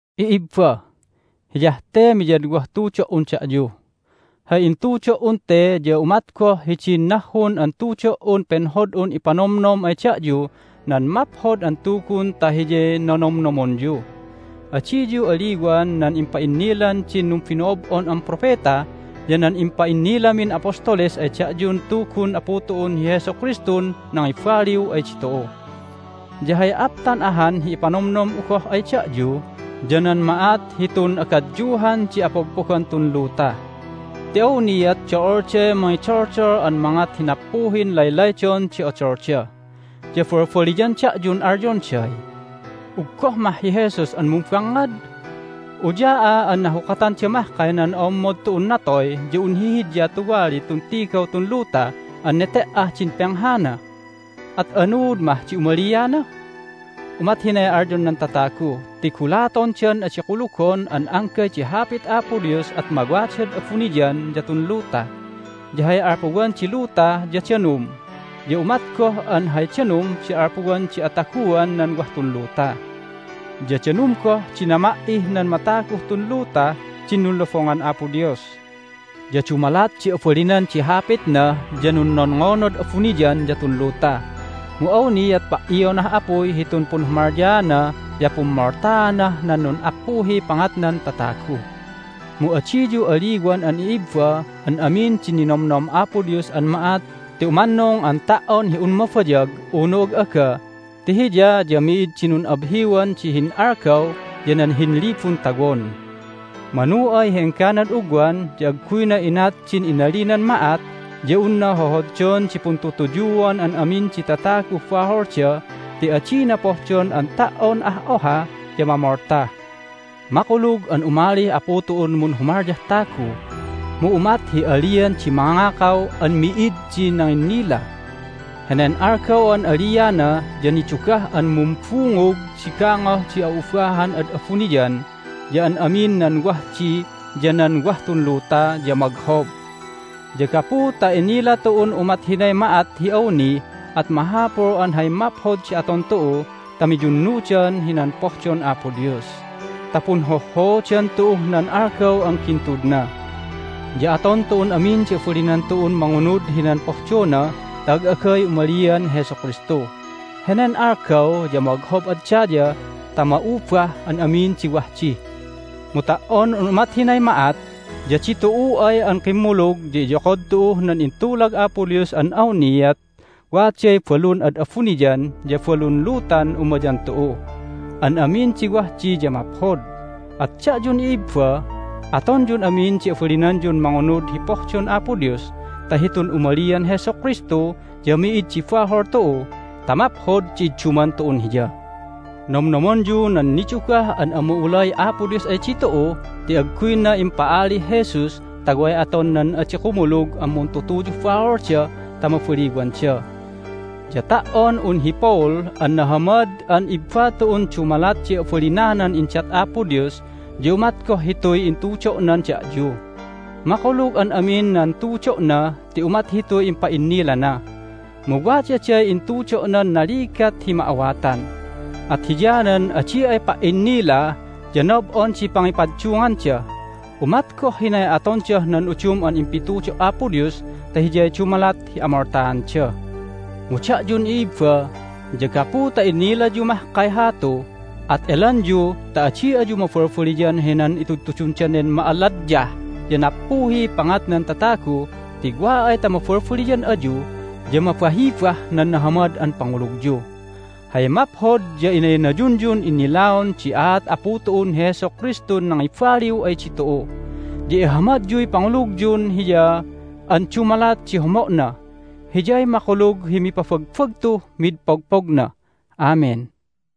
I'ibba, hiyah te miyadwah tudo"un da'yu. Hay intudo"un te ya umat goh hidin nahhun an tudo"un penhod'un ipanomnom ay da'yu nan Maphod an Tugun ta hiyay nonomnomonyu. Adiyu aliwan nan impa'innilan din numbino'ob'on an propeta ya nan impa'innilamin apostoles ay da'yun Tugun Apu tu'un hi Jesu Kristun nangibaliw ay ditu'u. Ya hay aptan ahan hi ipanomnom'u goh ay da'yu ya nan ma'at hitun agadyuhan di apogpogan tun luta. Ti awniat do'olday mangidoldol an mangat hi nappuhin laylaydon di odolda, ya balbaliyan da'yun alyonday, "Uggoh mah hi Jesus an mumbangngad? Uya'a an nahukatanda mahkay nan o'ommod tu'un natoy ya un hihidya tuwali tun tigaw tun luta an nete"ah din penghana! At anuud mah di umaliana?" Umat hinay alyon nan tatagu ti gulatondan adi kulugon an anggay di hapit Apo Dios at mawadad abuniyan ya tun luta. Ya hay alpuwan di luta ya danum, ya umat goh an hay danum di alpuwan di ataguan nan wah tun luta. Ya danum goh di nama"ih nan mataguh tun lutah din nunlobongan Apo Dios. Ya dumalat di abalinan di hapitna ya nunnonngonad abuniyan ya tun luta, mu awniat pa"ionah apuy hitun punhumalyaana ya pummoltaanah nan nun'appuhiy pangatnan tatagu. Mu adiyu aliwan an i'ibba an amin din ninomnom Apo Dios an ma'at ti umannung an ta"on hi un mabayag unu ag'aga ti Hiya ya mi'id di nun'abhiwan di hin'algaw ya nan hinlibun tawon. Manu ay hi engganad ugwan ya agguyna inat din inalinan ma'at ya unna hohoddon di puntutuyuan an amin di tataguh baholda ti adina pohdon an ta"on ah oha ya mamolta. Makulug an umalih Apu tu'un munhumalyah tagu, mu umat hi alian di mangakaw an mi'id di nanginnila. Henen algaw an aliana ya nidugah an mumbungug di gangoh di a'ubahan ad abuniyan, ya an amin nan wah di ya nan wah tun luta ya moghob. Ya gapu ta inila tu'un umat hinay ma'at hi awni at mahapul an hay maphod di aton tu'u ta miyunnudan hinan pohdon Apo Dios ta punhohhoodan tu'uh nan algaw an gintudna. Ya aton tu'un amin di abalinan tu'un mangunud hinan pohdona ta ag'agay umalian Jesu Kristu. Henen algaw ya moghob ad daya ta ma'ubah an amin di wah di. Mu ta"on un umat hinay ma'at ya ditu'u ay an kimmulug ya iyokod tu'uh nan intulag Apo Dios an awniat waday balun ad abuniyan ya balun lutan umayan tu'u. An amin di wah di ya maphod. At da'yun i'ibba, atonyun amin di abalinanyun mangunud hi pohdon Apo Dios ta hitun umalian Jesu Kristu ya mi'id di bahol tu'u ta maphod di idduman tu'un Hiya. Nomnomonyu nan nidugah an ama'ulay Apo Dios ay ditu'u ti agguyna impa'alih Jesus ta way aton nan adi kumulug an muntutuyuh baholda ta mabaliwanda. Ya ta"on un hi Paul an nahamad an ibba tu'un dumalat di abalinanan indat Apo Dios ya umat goh hituy intudo'nan da'yu. Makulug an amin nan tudo'na ti umat hituy impa'innilana. Mu wadaday intudo'nan naligat hi ma'awatan, at hiyanan adi ay pa"innila ya nob'on di pangipaddunganda. Umat goh hinay atondah nan udum an impitudo' Apo Dios ta hiyay dumalat hi amoltaanda. Mu da'yun i'ibba ya gapu ta inilayu mahkay hatu at elanyu ta adi ayu mabalbaliyan hinan itudtudun danen ma'aladyah ya nappuhiy pangatnan tatagu ti wa ay ta mabalbaliyan ayu ya mabahibah nan nahamad an pangulugyu. Hay maphod ya inaynayunyun innilaon di aat Apu tu'un hi Jesu Kristun nangibaliw ay ditu'u. Ya ihamadyuy pangulugyun Hiya an dumalat di homo'na. Hiyay makulug hi mipabagbagtuh mid pogpogna! Amen.